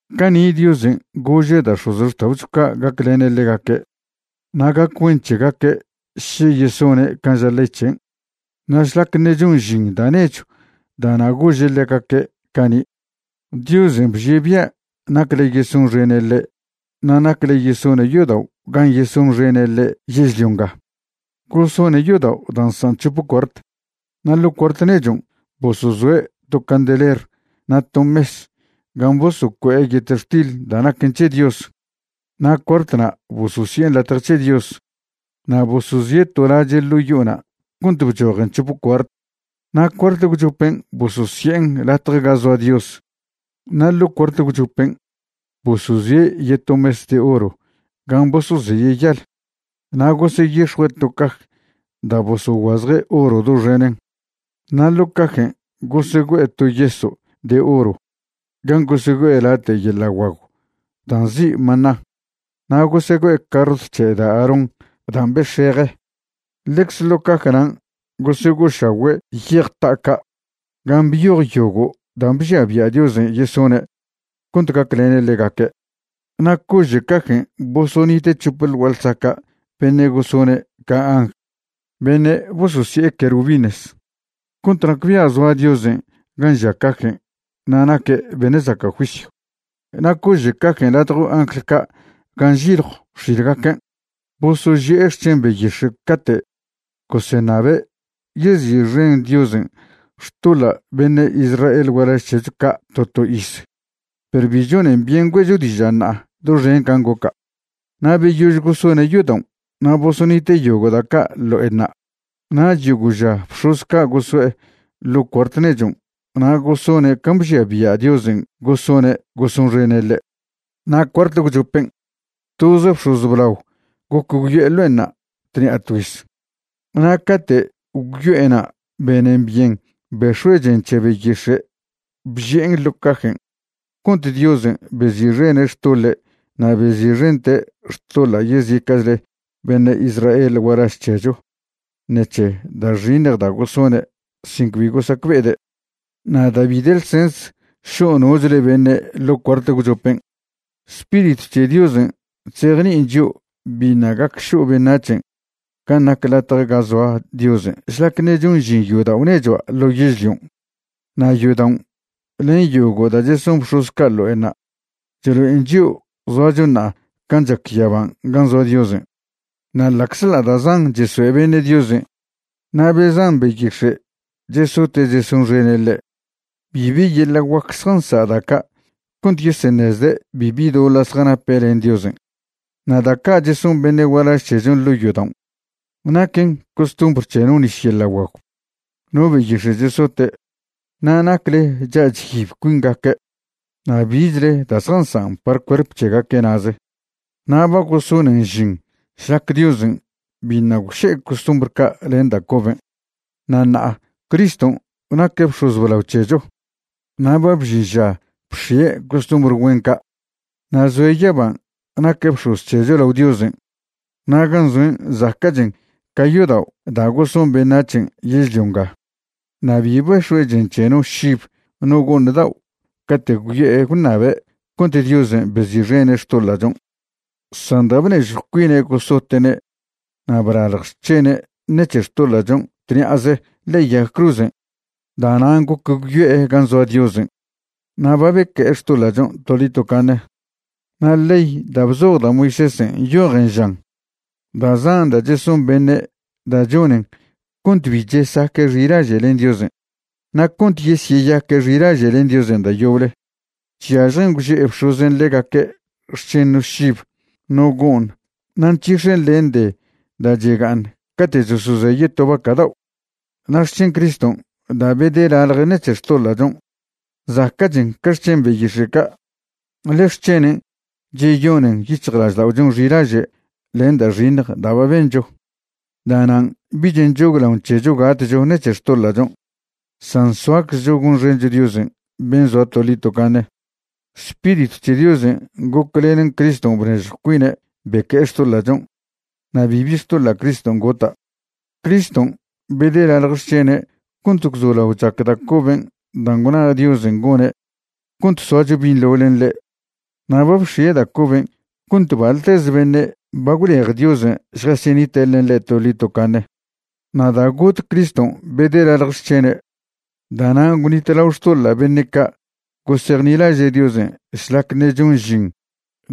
Cani' Diosen' gože' da' x̱ozxta'ocho ca' gaclene' ḻegaque' na' gac güen c̱hegaque' še yesone' can' ža ley c̱hen'. Na' šlac ṉe' chon žin da' nechw da'na' gože' ḻegaque' cani', Diosen' bžie' bia' nacle yesonxene' ḻe' na' nacle yesone' yodao' gan' yesonxene' ḻe' yežlio nga. Gosone' yodao' da' nsan' c̱hope cuart. Na' ḻo' cuart nechon' bosozoe' to candeler na' to mes gan' bosocue'e yetextil da' naquen c̱he Dios. Na' cuartna' bososi'en Latje c̱he Dios. Na' bosozie' to lache' ḻo' yo'ona' cont bchojen c̱hope cuart, na' cuart gwchopen' bososi'en Latje ga Zoa Dios. Na' ḻo' cuart gwchopen' bosozie' yeto mes de oro gan' bosozeye' yal. Na' goseyix̱jue' to caj da' bosoguazje' oro doxenen. Na' ḻo' cajen' gosegüe'e to yeso' de oro gan' gosegüe'e late' yeḻa' guagw da' nzi' maná, na' gosegüe'e carrot c̱he da' Aarón dan' bex̱eje. Ḻecze ḻo' caj nan' gosego'ošagüe' yej ta'a ca' gan' byoj yogo' dan' bžia bia' Diosen' yesone' cont gaclene' ḻegaque'. Na' cože' cajen' bosonite' c̱hope ḻ gua'a ḻsaca' beṉe' gosone' ca angl beṉe' bososi'e querubines, cont nacbia' zoa Diosen' gan' žia cajen' na' naque' beṉe' zaca' juisyw. Na' cože' cajen' ladjo angl ca' gan' nžiljo x̱ilgaquen', bosoži'e xc̱hen beyix̱e' cate' goseṉabe' yezi'xen Diosen' xtoḻa' beṉe' Israel gualaž c̱hecho ca' to to iz. Perw bi chonen byen güe'cho diža' ṉa'a doxen can' goca'. Na' beyož gosone' yodaon' na' bosonite' yogo' da' ca' ḻo'enṉa', nach yogo' ža bx̱oz ca' goso'e ḻo' cuart nechon' na' gosone' can' bžia bia' Diosen' gosone' gosonxene' ḻe'. Na' cuart gwchopen', toz bx̱oz blao goc gwyo'e ḻo'enṉa' tṉi'a tgüiz. Na' cate' gwyo'ena' benen byen bex̱oe' chen c̱he beyix̱e' bži'en ḻo cajen' cont Diosen' bezi'xene' xtoḻe' na' bezi'xente' xtoḻa' yezica'chle beṉe' Israel gualaž c̱hecho ṉec̱he da' xiṉj da' gosone' sin cbi gosacbe'ede'. Na' da' bi de ḻsens šo' nochle beṉe' ḻo' cuart gwchopen', Spiritw c̱he Diosen' chzejni'in chio' biṉa' gac šo' beṉac̱hen' gan' nac latje ga zoa Diosen' šlac ṉe' chon žin yodao' nechua' ḻo yežlion'. Na' yodaon' len yogo' da' cheson bx̱oz ca' ḻo'enṉa' chlo'en chio' zoacho ṉa'a can' chac yaban' gan' zoa Diosen'. Na' ḻa'czḻa' da' zan chesoe' beṉe' Diosen' na' be zan beyix̱e' chesote' chesonxene' ḻe', bibi yeḻa' guac zjansa' da' ca' cont yeseṉezde' bibi doḻa' zjanape' len Diosen'. Na' da' ca' cheson beṉe' gualaž c̱hechon' ḻo' yodaon' naquen costumbr c̱he no nis yeḻa' guagw, no beyix̱e' chesote', na' nacle cha' chyib cuingaque', na' bichle da' zjazacan' par cuerp c̱hegaque' na'ze. Na' ba gosonen žin šlac Diosen' biṉa' gwše'e costumbr ca' len da' coben'. Na' ṉa'a Criston' naque' bx̱oz blao c̱hecho na' ba bžin ža bx̱ie' costumbr güen ca'. Na' zoe' yaban' naque' bx̱oz c̱hecho lao Diosen', na' gan' zoen' zaca'chen ca yodao' da' goson beṉac̱hen' yežlio nga. Na' bi bex̱oe' chen c̱he no šib no go'ṉ dao' cate' gwyo'e gwṉabe' cont Diosen' bezi'xene' xtoḻa'chon', san da' bnežjw cuine' gosote'ne' na' blalj xc̱hene' ṉec̱he xtoḻa'chon' tṉi'aze ḻe'e yag cruzen', da'nan' goc gwyo'e gan' zoa Diosen' na' ba beque'e xtoḻa'chon' toḻi tocaṉe. Na' ley da' bzoj da' Moisésen' nyojen žan da' zan da' cheson beṉe' da' chonen cont bi chesaque' xilaže' len Diosen'. Na' cont yesyeyaque' xilaže' len Diosen' da' yoble, chyažjen gwže'e bx̱ozen' ḻegaque' xc̱hen no šib no go'ṉ na' nc̱hix̱en len de da' chega'aṉ cate' chosozeye' to vaca' dao'. Na' xc̱hen Criston' da' bedelalje' ṉec̱he xtoḻa'chon' zaca'chen ca xc̱hen beyix̱e' ca', ḻe xc̱henen' cheyonen yic̱hjlažda'ochon' xilaže' len da' xiṉj da' ba bencho. Da'nan' bich nchoglaon c̱hecho gatcho ṉec̱he xtoḻa'chon', san soaczcho gonxencho Diosen' ben' zoa toḻi tocaṉe. Spiritw c̱he Diosen' goclenen Criston' bnežjo cuine' beque'e xtoḻa'chon', na' bibi xtoḻa' Criston' gota'. Criston' bedelalj xc̱hene' cont gwzolao chac da' coben' dan' gwna Diosen' gone' cont soacho binḻo len ḻe'. Na' ba bx̱ie' da' coben' cont baḻteze beṉe' ba gwlej Diosen' šjasyenite' len ḻe' toḻi tocaṉe. Na' da' got Criston' bedelalj xc̱hene', da'nan gwnitlao xtoḻa' beṉe' ca' gosejnilaže' Diosen' šlac ṉe' chon žin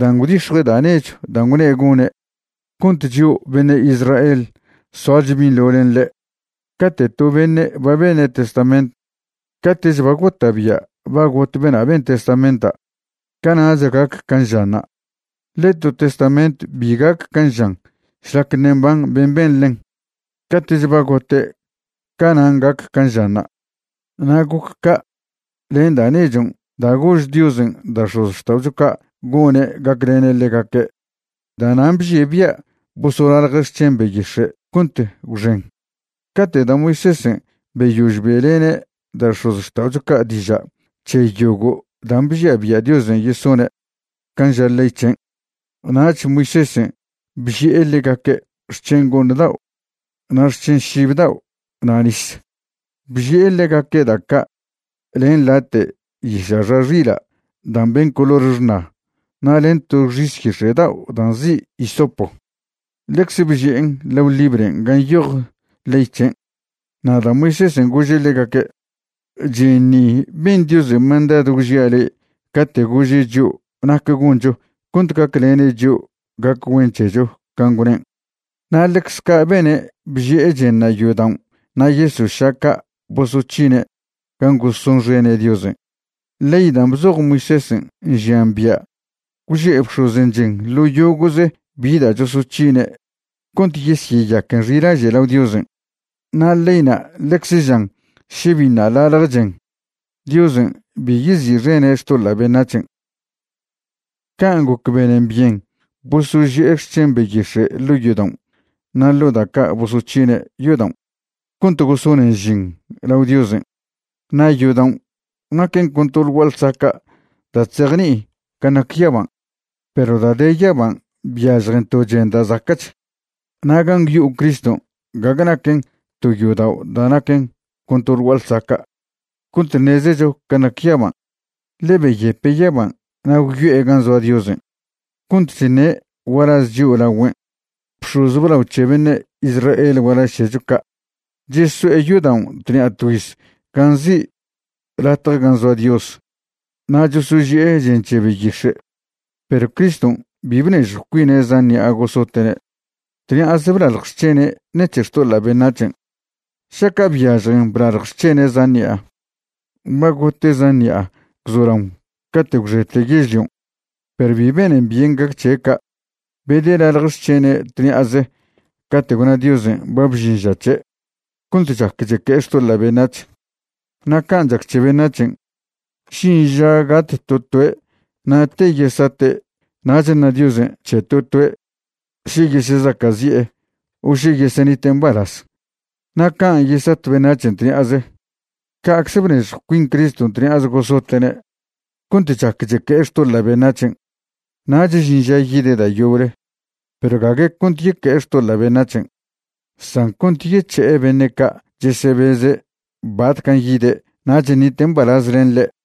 dan' gwdix̱jue' da' nechw dan' gwne' gone' cont chio' beṉe' Israel soacho binḻo len ḻe'. Cate' to beṉe' ba bene' testament, cate'ch ba gota'bia' ba got bena' ben testamenta', cana'ch gac can' žanṉa'. Ḻe to testament bi gac can' žan šlac ṉe' mban ben' ben ḻen. Cate'ch ba gote' canan' gac can' žanṉa'. Na' goc ca' len da' nechon' da' gož Diosen' da' x̱ozxta'ocho ca' gone' gaclene' ḻegaque'. Da'nan' bžie' bia' bosolalje' xc̱hen beyix̱e' cont gwxen. Cate' da' Moisésen' beyož be'lene' da' x̱ozxta'ocho ca' diža' c̱he yogo' dan' bžia bia' Diosen' yesone' can' ža ley c̱hen', nach Moisésen' bži'e ḻegaque' xc̱hen go'ṉ dao' na' xc̱hen šib dao' na' nis. Bži'e ḻegaque' da' ca' len late' yiša' xa xila' da' mben color xṉa na' len to xis yix̱e' dao' da' nzi' hisopo. Ḻecze bži'en lao libren' gan' nyoj ley c̱hen'. Na' da' Moisésen' gože' ḻegaque': “Chen ni ben Diosen' mandadw gwžia' le'e cate' gože' chio' nac goncho cont gaclene' chio' gac güen c̱hecho can' gwnen'.” Na' ḻecz ca' bene' bži'e chenṉa' yodaon' na' yeso' ša' ca' bosoc̱hine' gan' gosonxene' Diosen'. Ley dan' bzoj Moisésen' nžian bia' gwže'e bx̱ozen' chen ḻo yogo'ze bi da' chosoc̱hine' cont yesyeyaquen xilaže' lao Diosen'. Na' leyna' ḻecze žan še biṉa' lalj chen, Diosen' bi yezi'xene' xtoḻa' beṉac̱hen'. Can' goc benen byen bosoži'e xc̱hen beyix̱e' ḻo' yodaon' na' ḻo da' ca' bosoc̱hine' yodaon' cont gosonen žin lao Diosen', na' yodaon' naquen con to ḻ gua'a ḻsaca' da' chzejni'in can' nac yaban'. Perw da' de yaban' byažjen to chen da' zaca'ch. Na' gan' gwyo'o Criston' gague naquen to yodao' da' naquen con to ḻ gua'a ḻsaca' cont ṉezecho can' nac yaban'. Ḻe' beyepe' yaban' na' gwyo'e gan' zoa Diosen' cont chṉe' gualaz chio' lagüen'. Bx̱oz blao c̱he beṉe' Israel gualaž c̱hecho ca' cheso'e yodaon' tṉi'a tgüiz gan' nzi' Latje gan' Zoa Dios na' chosoži'e chen c̱he beyix̱e', perw Criston' bi bnežjw cuine' zan ṉi'a gosote'ne'. Tṉi'aze blalj xc̱hene' ṉec̱he xtoḻa' beṉac̱hen'. Šaca' byažjen blalj xc̱hene' zan ṉi'a, ba gote' zan ṉi'a gwzolaon cate' gwxete yežlion', perw bi benen byen gac c̱he' ca'. Bedelalj xc̱hene' tṉi'aze cate' gwna Diosen' ba bžin ža c̱he', cont chac cheque'e xtoḻa' beṉac̱h. Na' can' chac c̱he beṉac̱hen', žin ža gat to toe' na' te yesate' nach ṉa Diosen' c̱he to toe' še yesezaca'zi'e o še yesenite' mbalaz. Na' can' yesat beṉac̱hen' tṉi'aze, ca'cze bnežjw cuin Criston' tṉi'aze gosote'ne' cont chac cheque'e xtoḻa' beṉac̱hen'. Nach žin ža yide' da' yoble perw gague cont yeque'e xtoḻa' beṉac̱hen', san cont yec̱he'e beṉe' ca' chesebeze' batcan' yide' nach ṉite' mbalaz len ḻe'.